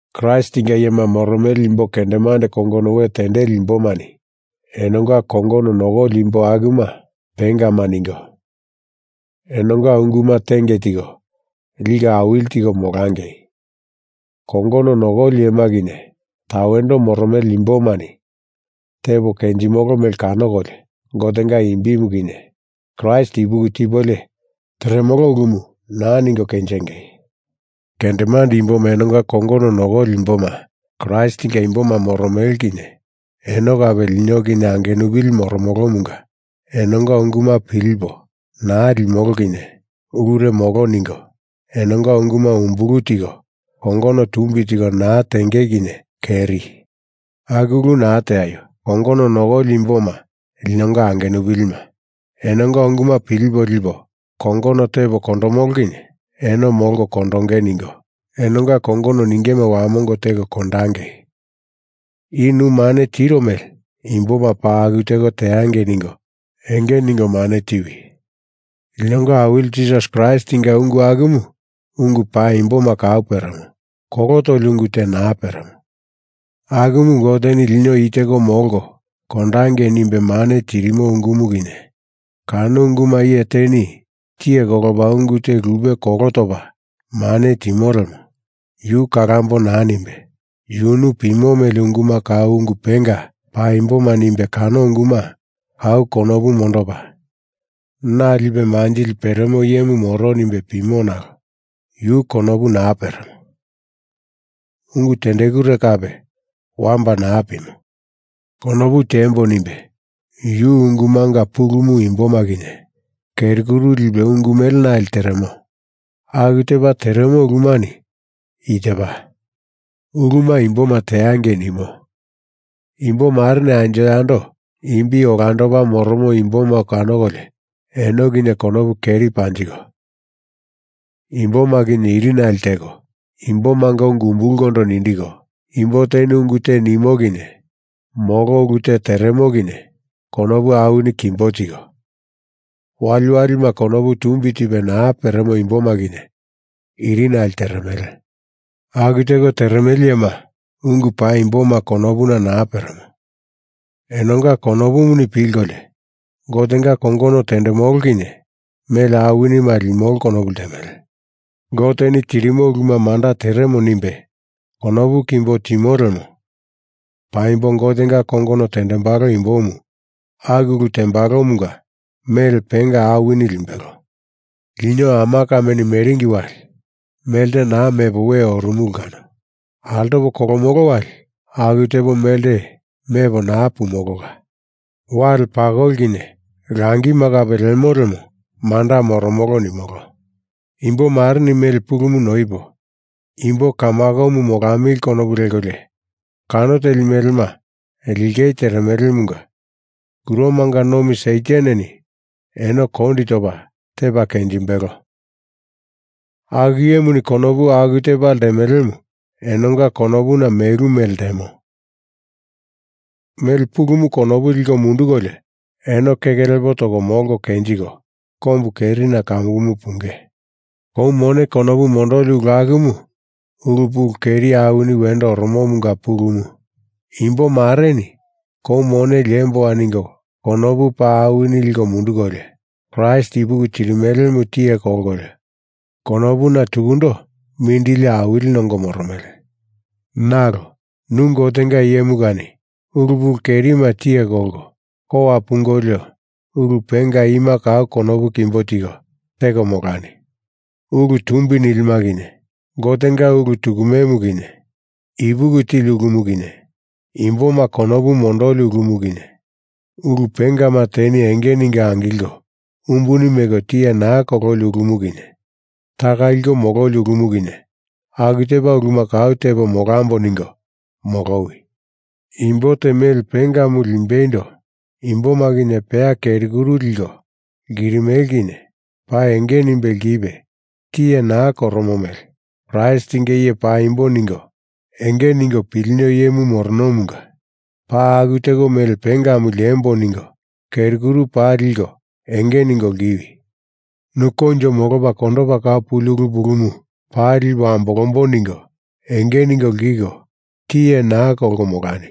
Kraistinga iyema moromele imbo kendemande kongono we tendeli imbomani enonga kongono nokoli imbo akuma pengama ningo enonga unguma tenge tiko, liko awili tiko molangei. Kongono nokoli iyema kinye tawendo moromele imbomani tepo kenjimolo mele kanokolio Gotenga imbimu kinye, Kraist ipuki tipolio teremolo ulumu naa ningo kenjengei. Kendemande imboma enonga kongono nokoli imboma Kraistinga imboma moromele kinye eno kape lino kinye angenupili moromolomunga enonga unguma pilipo naa limolo kinye ulure molo ningo, enonga unguma umbulu tiko kongono tumbi tiko naa tenge kinye keri. Aku ulu naa teaio! Kongono nokoli imboma linonga angenupilima, enonga unguma pilipo lipo kongono tepo kondomolo kinye eno molko kondonge ningo enonga kongono ningema wamongo teko kondangei. I nu mane tiro mele imboma paa aku teko teangei ningo enge ningo mane tiwi. Linonga Awili Jisasi Kraistinga ungu akumu ungu paimboma kau peremo, kolo toli ungu te naa peremo. Akumu Goteni lino i teko molko kondangei nimbe mane tirimo ungumu kinye, kano unguma iye teni tiye kolopa ungu te lupe kolo topa mane timo lemo yu kalambo naa nimbe yunu pimo mele unguma kau ungu penga paimboma nimbe kano unguma kau konopu mondopa na lipe manjili peremo iyemu moro nimbe pimo nalo yu konopu naa peremo, ungu tendekure kape wamba naa pimo. Konopu tiembo nimbe yu ungumanga pulumu imboma kinye keri kuru lipe ungu melenale teremo. Aku tepa teremo ulumani i tepa: Uluma imboma teangei nimo, imbo mareni anjo yando imbi olandopa moromo imboma kanokolio eno kinye konopu keri panjiko, imboma kinye irinale teko, imbomanga ungu umbulkondo nindiko, imbo teni ungu te nimo kinye molo ulu te teremo kinye konopu awini kimbo tiko, waliwalima konopu tumbi tipe naa peremo imboma kinye irinale teremele. Aku teko teremele iyema ungu paimboma konopuna naa peremo. Enonga konopuni pilkolio, Gotenga kongono tendemolo kinye mele awinima limolo konopu ltemele. Goteni tirimo uluma manda teremo nimbe konopu kimbo timo lemo paimbo Gotenga kongono tendembalo imbomu aku ulu tembalomunga mele penga awini limbelo. Lino ama kameni meringi wali melte naa mepo we orumulu kano. Altopo kolomolo wali aku tepo melte mepo naa pumolola. Wale pakoli kinye langima kape lemo lemo manda moromolo nimolo. Imbo mareni mele pulumu noipo imbo kamakomu molamili konopu lekolio kano teli melema lingei teremelemunga kuromanga nomi Sataneni eno kondi topa tepa kenjimbelo. Aku iyemuni konopu aku tepa ltemelemu enonga konopuna melu mele ltemo. Mele pulumu konopu liko mundukolio eno keke lepo toko molko kenjiko kombu kerina kamukumu punge. Kou mone konopu mondoli ulu akumu ulu pulu keri awini wendo oromomunga pulumu. Imbo mareni kou mone liemboa ningo konopu paa awini liko mundukolio Kraist ipuki tirimelemu tiye kolkolio konopuna tukundo mindili awili nongo moromele. Nalo, nu Gotenga iyemu kani ulu pulu kerima tiye kolko kowa pungolio ulu penga ima kau konopu kimbo tiko teko molani: Ulu tumbi nilima kinye, Gotenga ulu tukumemu kinye, ipuki tili ulumu kinye, imboma konopu mondoli ulumu kinye, ulu pengama teni enge ningo angilko umbuni meko tiye naa kololi ulumu kinye, taka liko mololi ulumu kinye, aku tepa uluma kau tepo molambo ningo molowi. Imbo te mele pengamu limbeindo imboma kinye peya keri kuru liko lkirimele kinye paa enge nimbe lkipe tiye naa koromo mele Kraistinga iye paimbo ningo enge ningo pilino iyemu moronomunga paa aku teko mele pengamu liembo ningo keri kuru paa liko enge ningo lkiwi! Nu koinjo molopa kondopa kau puli ulu pulumu paa lipo ambolambo ningo enge ningo lkiko tiye naa kolko molani.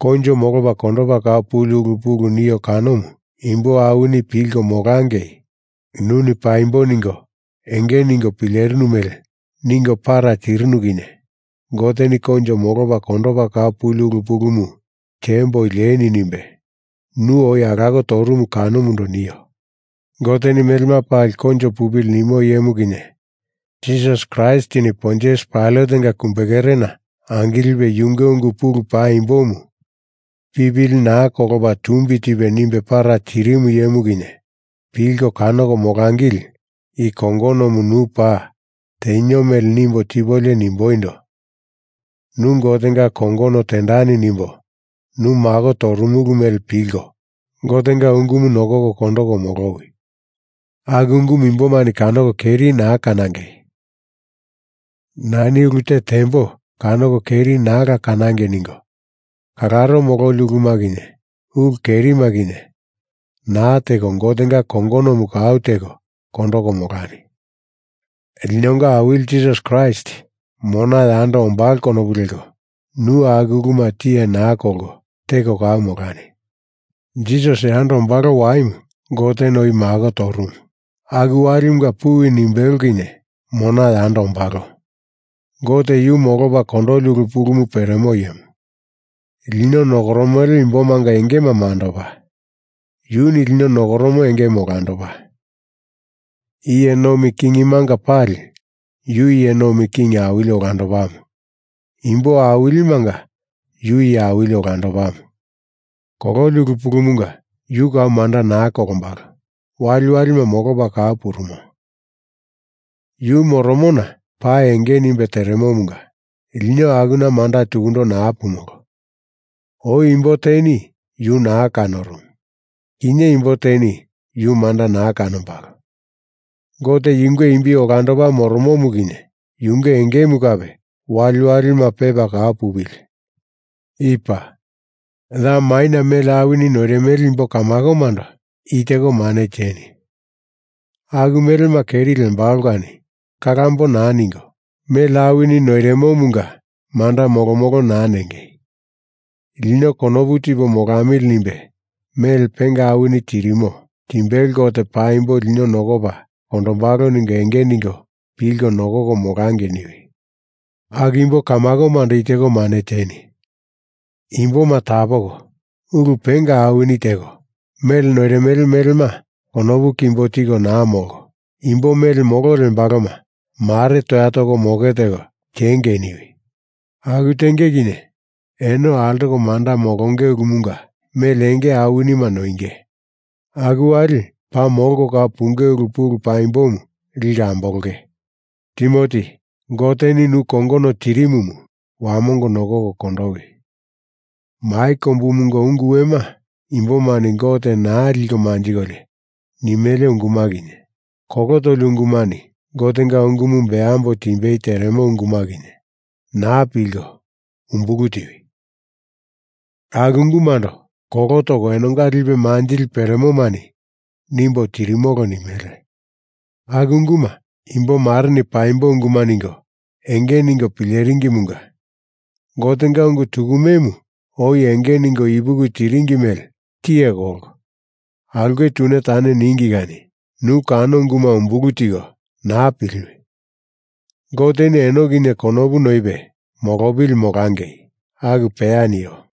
Koinjo molopa kondopa kau puli ulu pulu nio kanomu imbo awini pilko molangei nuni paimbo ningo enge ningo pilerinu mele ningo para tirinu kinye Goteni koinjo molopa kondopa kau puli ulu pulumu tiemboi lieni nimbe nu oi alako torumu kanomundo nio. Goteni melema pali koinjo pupili nimo iyemu kinye, Jisasi Kraistini Pontius Pailatenga kumbekerena angilipe yunge ungu pulu paimbomu pipili naa kolopa tumbi tipe nimbe para tirimu iyemu kinye, pilko kanoko molangili i kongonomu nu paa tenio mele nimbo tipolio nimboindo, nu Gotenga kongono tendani nimbo nu mako torumulu mele pilko Gotenga ungumu nokoko kondoko molowi! Aku ungumu imbomani kanoko keri naa kanangei. Nani ulu te tembo kanoko keri naala kanangei ningo kalaro mololi uluma kinye ulu kerima kinye naa teko Gotenga kongonomu kau teko kondoko molani. Linonga Awili Jisasi Kraist mona yando ombalo konopu leko nu aku uluma tiye naa kolko teko kau molani. Jisas yando ombalo waimu Goteni oi mako torumu aku walimunga puwi nimbelo kinye mona yando ombalo. Gote yu molopa kondoli ulu pulumu peremo iyemu. Lino nokoromele imbomanga engema mandopa, yuni lino nokoromo engemu olandopa. Iye nomi kingimanga pali yu iye nomi king awili olandopamu. Imbo awilimanga yu iye awili olandopamu. Kololi ulu pulumunga yu kau manda naa kolombalo, waliwalima molopa kau purumo. Yu moromona pa enge nimbe teremomunga lino akuna manda tukundo naa pumolo. Oi imbo teni yu naa kanorumu. Kinye imbo teni yu manda naa kanombalo. Gote yunge imbi olandopa moromomu kinye yunge engemu kape waliwalima pepa kau pupili. I paa. Ya maina mele awini noirimele imbo kamakomando i teko mane tieni: Aku melema keri lembalo kani kalambo naa ningo, mele awini noirimomunga manda molomolo naa nengei. Lino konopu tipo molamili nimbe mele penga awini tirimo timbelo Gote paimbo lino nokopa kondombalo ningo enge ningo pilko nokoko molangei niwi. Aku imbo kamakomando i teko mane tieni: Imboma tapoko, ulu penga awini teko, mele noirimele melema konopu kimbo tiko naa molko, imbo mele molo lembaloma mare toya toko moke teko tiengei niwi. Aku tenge kinye eno altoko manda molonge ulumunga mele enge awinima noinge aku wali paa molko kau punge ulu pulu paimbomu liko ambolonge. Timoti, Goteni nu kongono tirimumu wamongo nokoko kondowi. Mai kombumunga ungu wema, imbomani Gote naa liko manjikolio nimele unguma kinye, kolo toli ungumani Gotenga ungumu beambo timbei teremo unguma kinye, naa pilko, umbulu tiwi. Aku ungumando kolo toko enonga lipe manjili peremomani nimbo tirimolo nimele. Aku unguma imbo mareni paimbo unguma ningo enge ningo pileringimunga Gotenga ungu tukumemu oi enge ningo ipuki tiringi mele tiye kolko aulke tune tane ningi kani nu kano unguma umbulu tiko naa piliwi! Goteni eno kinye konopu noipe molopili molangei. Aku peya nio.